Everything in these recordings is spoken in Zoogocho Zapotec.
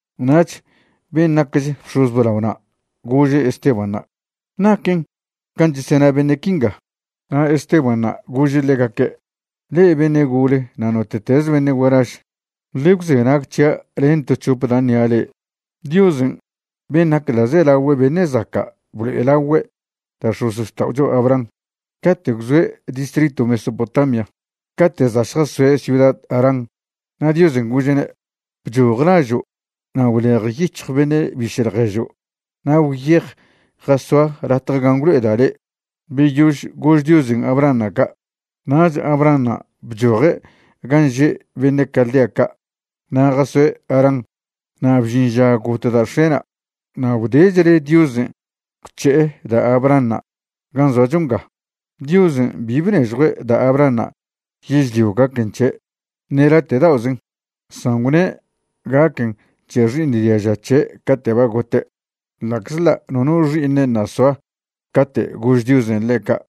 Nach ben' nacch bx̱oz blaona' gože' Estebanṉa': ―¿Naquen can' chesena beṉe' quinga? Na' Estebanṉa' gože' ḻegaque': ―Le'e beṉe' gole na' note'teze beṉe' gualaž, ḻe gwzenag c̱hia' len to c̱hop da' ṉia' le'e. Diosen' ben' nac ḻa'zelagüe beṉe' zaca' blo'elagüe' da' x̱ozxta'ocho Abraham cate' gwzoe' distritw Mesopotamia cate' za' šjasoe' ciuda Harán. Na' Diosen' gože'ne': “Bchoj lažo' na' gwlejyic̱hj beṉe' biše' ḻježo' na' gwyej jasoa latje gan' gwlo'eda' le'.” Beyož gož Diosen' Abrahanṉa' ca', nach Abrahanṉa' bchoje' gan' že' beṉe' Caldea ca' na' jasoe' Harán. Na' bžin ža got da' x̱e'na' na' gwdechle Diosen' gwc̱he'e da' Abrahanṉa' gan' zoacho nga. Diosen' bi bnežjue' da' Abrahanṉa' yežlio gaquen c̱he', ṉe late' da'ozen', san gwne' gaquen c̱he xi'iṉ diaža c̱he' cate' ba gote', ḻa'czḻa' nono xi'iṉe' ṉa' soa cate' gož Diosen' ḻe' ca'.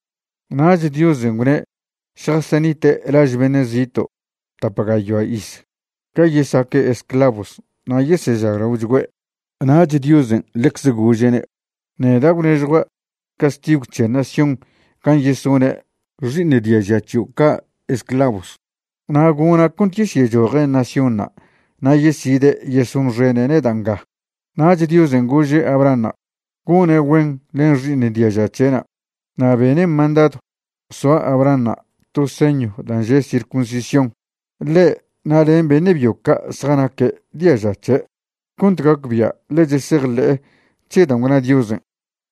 Nach Diosen' gwne' šjasenite' laž beṉe' zito' tap gayoa iz ga yesaque' esclavos na' yesežaglaochgüe'. Nach Diosen' ḻecze gože'ne': “Neda' gwnežjua' castigw c̱he nación gan' yesone' xi'iṉ diaža c̱hio' ca' esclavos na' gona' cont yesyechoje' naciónṉa' na' yeside' yesonxene' neda' nga.” Nach Diosen' gože' Abrahanṉa' gone' güen len xi'iṉ diaža c̱he'na'. Na' bene' mandadw soa Abrahanṉa' to señw dan' že' circuncisión, ḻe' na' len beṉe' byo ca' zjanaque' diaža c̱he', cont gacbia' ḻe chesejḻe'e c̱he dan' gwna Diosen'.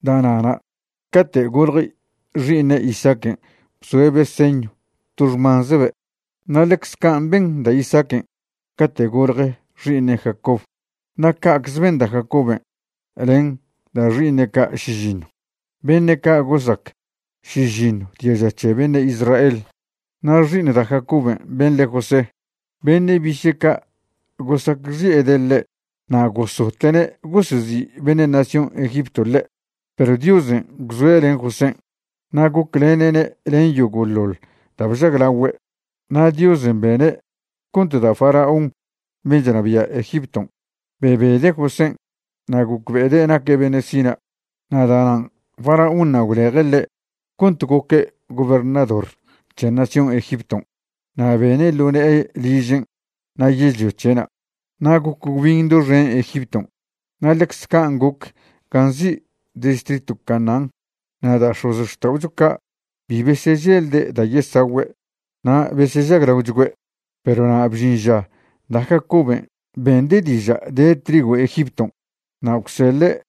Da'na'na' cate' goḻje xi'iṉe' Isaaquen' bzoe'be' señw to xmanzebe', na' ḻecze can' ben da' Isaaquen' cate' gol je xi'iṉe' Jacob. Na' ca'cze ben da' Jacoben' len da' xi'iṉe' ca' šižiṉw, beṉe' ca' gosac šižiṉw diaža c̱he beṉe' Israel. ’Na' xi'iṉ da' Jacoben' ben' le José, beṉe' biše' ca' gosacxi'ede' ḻe' na' gosote'ne' gosezi' beṉe' nación Egipto ḻe'. Perw Diosen' gwzoe' len Josén'. Na' goclene'ne' len yogo'ḻoḻ da' bžaglagüe'. Na' Diosen' bene' cont da' faraón ben' chnabia' Egipton' bebede' Josén' na' gocbe'ede' naque' beṉe' sina'. Na' da'nan' faraónṉa' gwleje' ḻe' cont goque' gobernador c̱he nación Egipton' na' bene' ḻo ne'e ližen' na' yežlio c̱he'na'. ’Na' goc gwbin doxen Egipton' na' ḻecze can' goc gan' nzi' distritw Canaán na' da' x̱ozxta'ocho ca' bi beseželde' da' yesagüe' na' besežaglaochgüe'. Perw na' bžin ža da' Jacoben' bende' diža' de trigw Egipton' na' gwseḻe'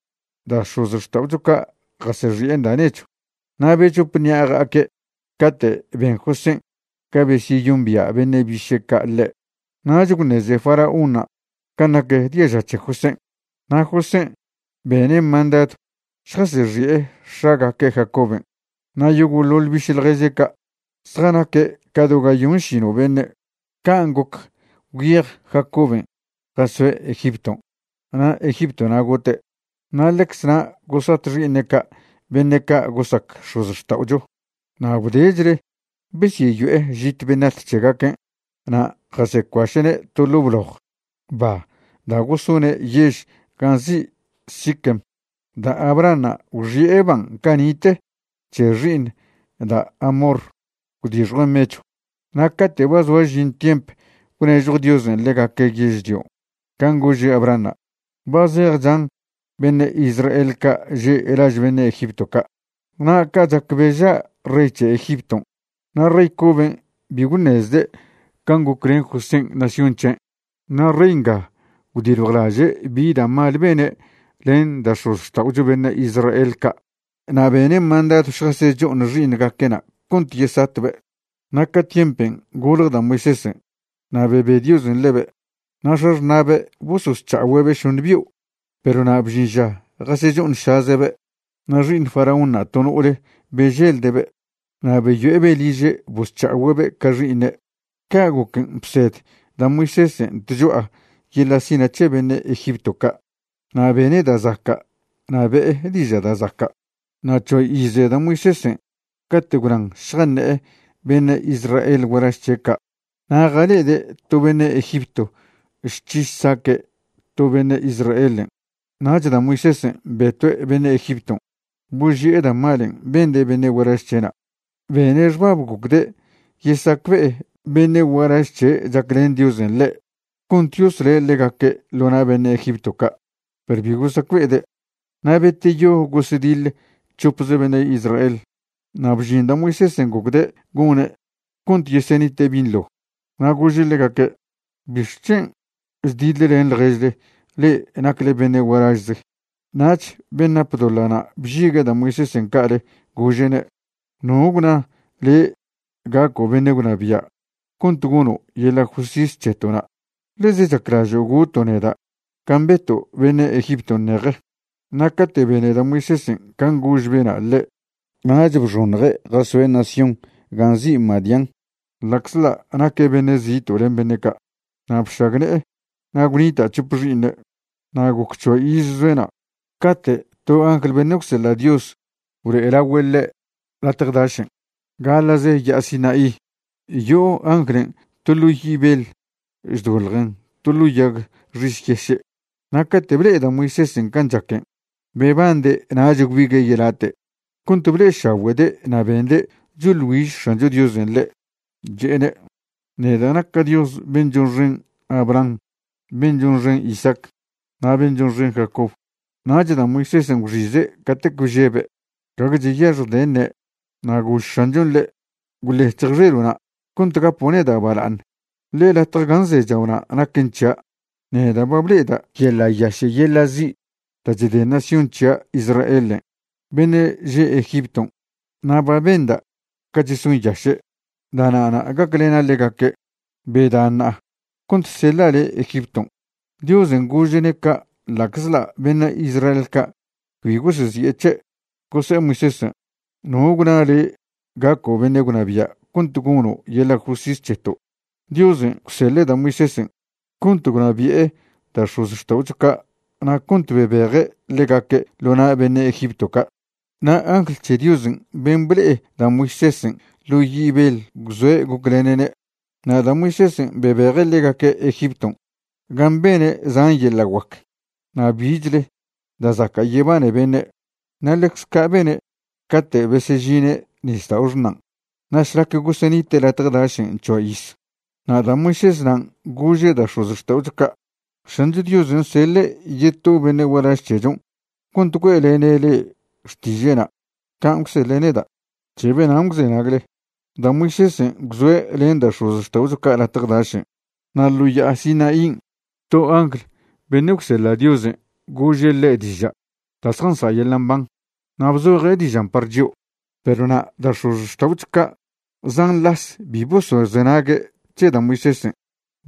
da' x̱ozxta'ocho ca' jasexi'en da' nechw. Na' bechop ṉi'a ja'aque' cate' ben Josén' ga besyeyombia' beṉe' biše' ca' ḻe', nach gwṉeze faraónṉa' can' nac diaža c̱he Josén'. Na' Josén' bene' mandadw šjasexi'e x̱agaque' Jacoben' na' yogo'ḻoḻ biše' ḻježe' ca', zjanaque' ca do gayonšino' beṉe'. Can' goc gwyej Jacoben' jasoe' Egipton' na' Egiptona' gote', na' ḻecz na' gosat xi'iṉe' ca' beṉe' ca' gosac x̱ozxta'ocho. Na' gwdechle besyeyo'e žit benat c̱hegaquen' na' jasecuaše'ne' to ḻo' bloj ba da' gosone' yež gan' nzi' Siquem. Da' Abrahanṉa' gwxi'e ban' cani'te c̱he xi'iṉ da' Hamor gwdixjuen' mechw. ’Na' cate' ba zoa žin tiemp gwnežjo Diosen' ḻegaque' yežlio can' gože' Abrahanṉa', ba zej chan beṉe' Israel ca' že' laž beṉe' Egipto ca'. Na' ca' chac beža' rey c̱he Egipton' na' rey coben' bi gwṉezde' can' goclen Josén' nación c̱hen'. Na' rey nga gwdiljwlaže' bi da' mal bene' len da' x̱ozxta'ocho beṉe' Israel ca' na' bene' mandadw šjasecho'oṉ xi'iṉgaque'na' cont yesatbe'. Na' ca tiempen' golje da' Moisésen' na' bebe Diosen' ḻebe', na' x̱axṉa'be' bososc̱ha'ogüe'be' šoṉe bio'. Perw na' bžin ža jasecho'oṉšaze'be' na' xi'iṉ faraónṉa' to no'ole beželde'be' na' beyo'ebe' liže' bosc̱ha'ogüe'be' ca xi'iṉe'. Ca' goquen' bsed da' Moisésen' tcho'a yeḻa' sina' c̱he beṉe' Egipto ca' na' bene' da' zaca' na' be'e diža' da' zaca'. ’Na' c̱hoa ize da' Moisésen' cate' gwnan šjaṉe'e beṉe' Israel gualaž c̱he' ca'. Na' jale'ede' to beṉe' Egipto chc̱hi chsaque' to beṉe' Israelen'. Nach da' Moisésen' betue' beṉe' Egipton', boži'e da' malen' bende' beṉe' gualaž c̱he'na'. Bene' xbab gocde' yesacbe'e beṉe' gualaž c̱he' chaclen Diosen' ḻe' cont yosle' ḻegaque' ḻo na' beṉe' Egipto ca', perw bi gosacbe'ede'. Na' beteyo gosediḻ c̱hopze beṉe' Israel. Na' bžin da' Moisésen' gocde' gone' cont yesenite' binḻo, na' gože' ḻegaque': “¿Bixc̱hen' chdiḻlen ḻježle le'e nacle beṉe' gualažze?” Nach ben' nap doḻa'na' bžigue' da' Moisésen' ca'ale gože'ne': “¿No gwna le' gaco' beṉe' gwnabia' cont gono' yeḻa' justis c̱heto'na'? ¿Ḻez chaclažo' goto' neda' can' beto' beṉe' Egipton' ṉeje?” Na' cate' bene da' Moisésen' can' gož bena' ḻe' nach bxoṉje' jasoe' nación gan' nzi' Madián ḻa'czḻa' naque' beṉe' zito' len beṉe' ca'. Na' bšagne'e na' gwnita' c̱hope xi'iṉe'. ’Na' goc c̱hoa iz zoe' na', cate' to angl beṉe' gwseḻa' Dios blo'elagüe' ḻe' latje dašen' gaḻa'ze Ya'a Sinaí, yo'o anglen' to ḻo' yi' beḻ chdoḻjen to ḻo' yag xis yeše'. Na' cate' ble'e da' Moisésen' can' chaquen' bebande' nach gwbigue' yelate' cont ble'ešagüe'de' na' bende' choḻ güiž X̱ancho Diosen' ḻe', che'ene': “Neda' naca' Dios ben' chonxen Abraham, ben' chonxen Isaac, na' ben' chonxen Jacob.” Nach da' Moisésen' gwxize' catec bžebe', gague cheyaxjde' ṉe'e. Na' gož X̱anchon' ḻe': “Gwḻec̱hj xelo'na' cont gapo' neda' bala'aṉ, ḻe latje gan' zechao'na' naquen c̱hia'. Neda' ba ble'eda' yeḻa' yaše' yeḻa' zi' da' chde nación c̱hia' Israelen' beṉe' že' Egipton' na' ba benda' ca chesonyaše'. Da'na'na' gaclena' ḻegaque'. Beda ṉa'a cont seḻa' le' Egipton'.” ’Diosen' gože'ne' ca' ḻa'czḻa' beṉe' Israel ca' cbi gosezi'e c̱he', gose'e Moisésen': “¿No gwna le' gaco' beṉe' gwnabia' cont gono' yeḻa' justis c̱heto'?” Diosen' gwseḻe' da' Moisésen' cont gwnabi'e da' x̱ozxta'ocho ca' na' cont bebeje' ḻegaque' ḻo na' beṉe' Egipto ca', na' angl c̱he Diosen' ben' ble'e da' Moisésen' ḻo' yi' beḻ gwzoe' goclene'ne'. Na' da' Moisésen' bebeje' ḻegaque' Egipton' gan' bene' zan yeḻa' guac na' bichle da' zaca' yebane beṉe', na' ḻecz ca' bene' cate' besežine' Nisdao' Xṉan' na' šlac gosenite' latje dašen' c̱hoa iz. Na' da' Moisésnan' gože' da' x̱ozxta'ocho ca': “X̱ancho Diosen' seḻe' yeto beṉe' gualaž c̱hechon' cont güe'lene' le'e xtiže'na' can' gwseḻe' neda'. C̱he benan' gwzenagle.” Da' Moisésen' gwzoe' len da' x̱ozxta'ocho ca' latje dašen', na' ḻo Ya'a Sinaín' to angl beṉe' gwseḻa' Diosen' gože' ḻe' diža' da' zjansa' yeḻa' mban, na' bzoje' dižan' par chio'. ’Perw na' da' x̱ozxta'ocho ca' zan las bi bosozenague' c̱he da' Moisésen',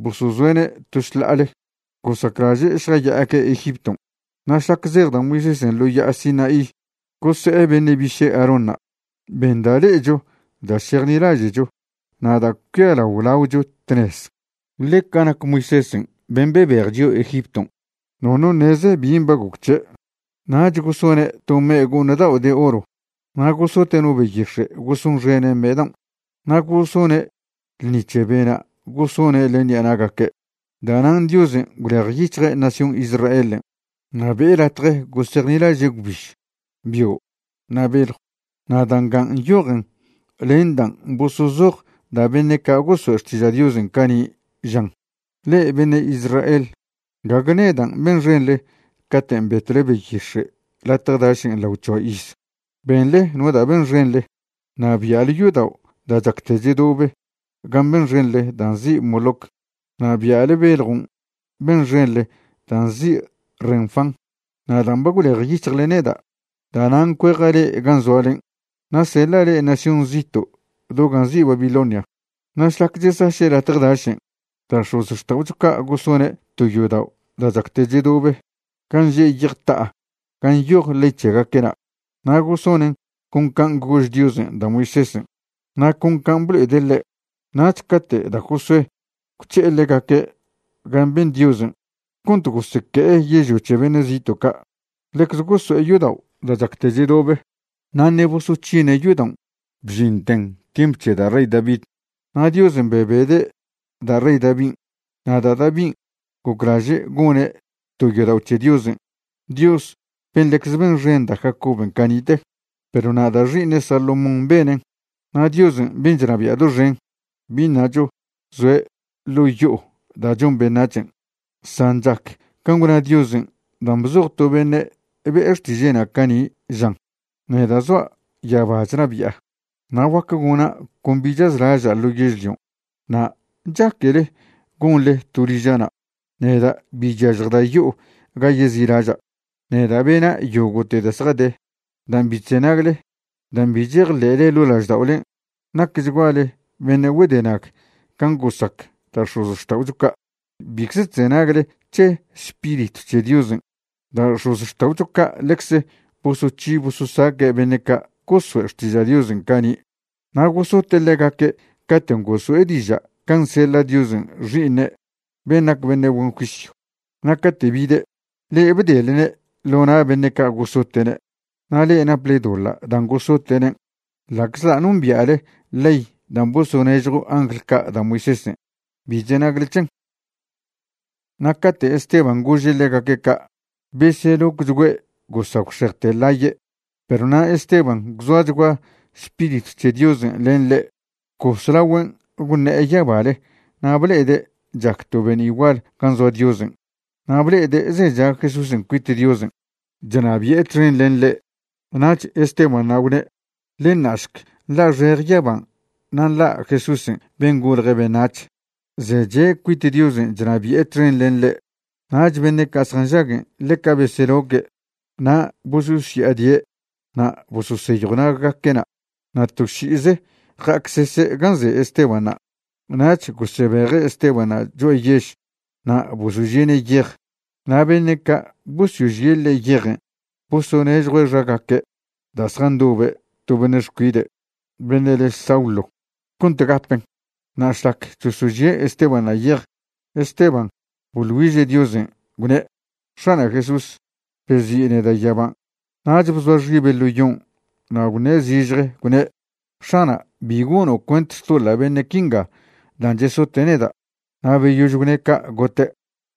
bosozoe'ne' to šḻa'ale. Gosaclaže' šjaya'aque' Egipton'. Na' šlac zej da' Moisésen' ḻo Ya'a Sinaí, gose'e beṉe' biše' Aarónṉa': “Ben da' le'echo da' šejnilaže'cho na' da' cuialao laocho tnez. Ḻe ca nac Moisésen' ben' bebej chio' Egipton', nono ṉeze bin' ba goc c̱he'.” Nach gosone' to me' go'ṉ dao' de oro na' gosote' no beyix̱e' gosonxene' me' daon', na' gosone' ḻṉi c̱he bena' gosone' len ṉi'a na'gaque'. Da'nan' Diosen' gwlejyic̱hje' nación Israelen' na' be'e latje gosejnilaže' gwbiž, bio', na' beḻjw. Na' da' nga nyojen len dan' bosozoj da' beṉe' ca' goso'e xtiža' Diosen' cani', žan: Le'e beṉe' Israel, gague nedan' benxenḻe caten' betwle beyix̱e' latje dašen' lao c̱hoa iz. Benḻe no da' benxenḻe, na' bia'le yodao' da' chacte chedobe gan' benxenḻe dan' nzi' Moloc, na' bia'le beljon' benxenḻe dan' nzi' Renfán. Na' dan' ba gwlejyic̱hjle neda', da'nan' cueja' le'e gan' zoalen' na' seḻa' le'e nación zito' do gan' nzi' Babilonia. ’Na' šlac chesaše' latje dašen', da' x̱ozxta'ocho ca' gosone' to yodao' da' chacte chedobe gan' že' yej ta'a gan' nyoj ley c̱hegaque'na'. Na' gosonen' con can' gož Diosen' da' Moisésen' na' con can' blo'ede' ḻe'. Nach cate' da' Josué gwc̱he'e ḻegaque' gan' ben Diosen' cont goseque'e yežlio c̱he beṉe' zito' ca', ḻecze goso'e yodao' da' chacte chedobe. Na' ṉe' bosoc̱hine' yodaon' bžinten tiemp c̱he da' rey David. Na' Diosen' bebede' da' rey Davin', na' da' Davin' goclaže' gone' to yodao' c̱he Diosen', Dios ben' ḻecze benxen da' Jacoben' cani'te. Perw na' da' xi'iṉe' Salomón benen'. Na' Diosen' ben' chnabia' doxen, bi ṉacho zoe' ḻo' yo'o da' chon beṉac̱hen', san chac can' gwna Diosen' dan' bzoj to beṉe' be' xtiže'na' cani', žan: Neda' zoa' yaba chnabia', na' guac gona' con bi chazlaža' ḻo yežlion'. Na' ¿chaquele gonḻe to liža'na'? Neda' bi chyažjda' yo'o ga yezi'laža'. Neda' bena' yogo'te da' zjade. ’Dan' bi chzenagle, dan' bi chejḻe'le ḻo' lažda'olen' nacchguale beṉe' güedenag can' gosac da' x̱ozxta'ocho ca'. Bicze chzenagle c̱he Spiritw c̱he Diosen'. Da' x̱ozxta'ocho ca' ḻecze bosoc̱hi bososaque' beṉe' ca' goso'e xtiža' Diosen' cani', na' gosote' ḻegaque' caten' goso'e diža' can' seḻa' Diosen' Xi'iṉe' ben' nac beṉe' güen juisyw. Na' cate' bide', le'e bdelne' ḻo na' beṉe' ca' gosote'ne' na' le'e naple doḻa' dan' gosote'nen'. Ḻa'czḻa' nombia'le ley dan' bosonežjw angl ca' da' Moisésen', bi chzenagle c̱hen. Na' cate' Esteban' gože' ḻegaque' ca', beselocchgüe' gosagwxejte ḻaye'. Perw na' Esteban' gwzoachgua Spiritw c̱he Diosen' len ḻe', bcos lagüen' gwṉe'e yabale na' ble'ede' chac to be'ni' gual gan' zoa Diosen' na' ble'ede' zecha Jesúsen' cuit Diosen' chnabi'e txen len ḻe'. Nach Estebanṉa' gwne': ―Ḻe ṉa'šc nḻa'xeje yaban' na' nḻa' Jesúsen' ben' golje' beṉac̱h zeche' cuit Diosen' chnabi'e txen len ḻe'. Nach beṉe' ca' zjanžaguen' ḻeca beseloque' na' bososya'adie' na' bososeyjw naggaque'na' na' to ši'ize ja'acsese' gan' ze Estebanṉa'. Nach gosebeje' Estebanṉa' cho'a yež na' bosožie'ne' yej. Na' beṉe' ca' bosožie' ḻe' yejen' bosonežjue' xagaque' da' zjandobe' to beṉe' xcuide' beṉe' le Saulo cont gapen'. Na' šlac chosožie' Estebanṉa' yej, Esteban' boḻ güiže' Diosen', gwne': ―X̱ana' Jesús, bezi' neda' yaban'. Nach bzoa xibe' ḻo yon' na' gwṉe' zižje, gwne': ―X̱ana' bi gono' cuent xtoḻa' beṉe' quinga dan' chesote' neda'. Na' beyož gwne' ca', gote'.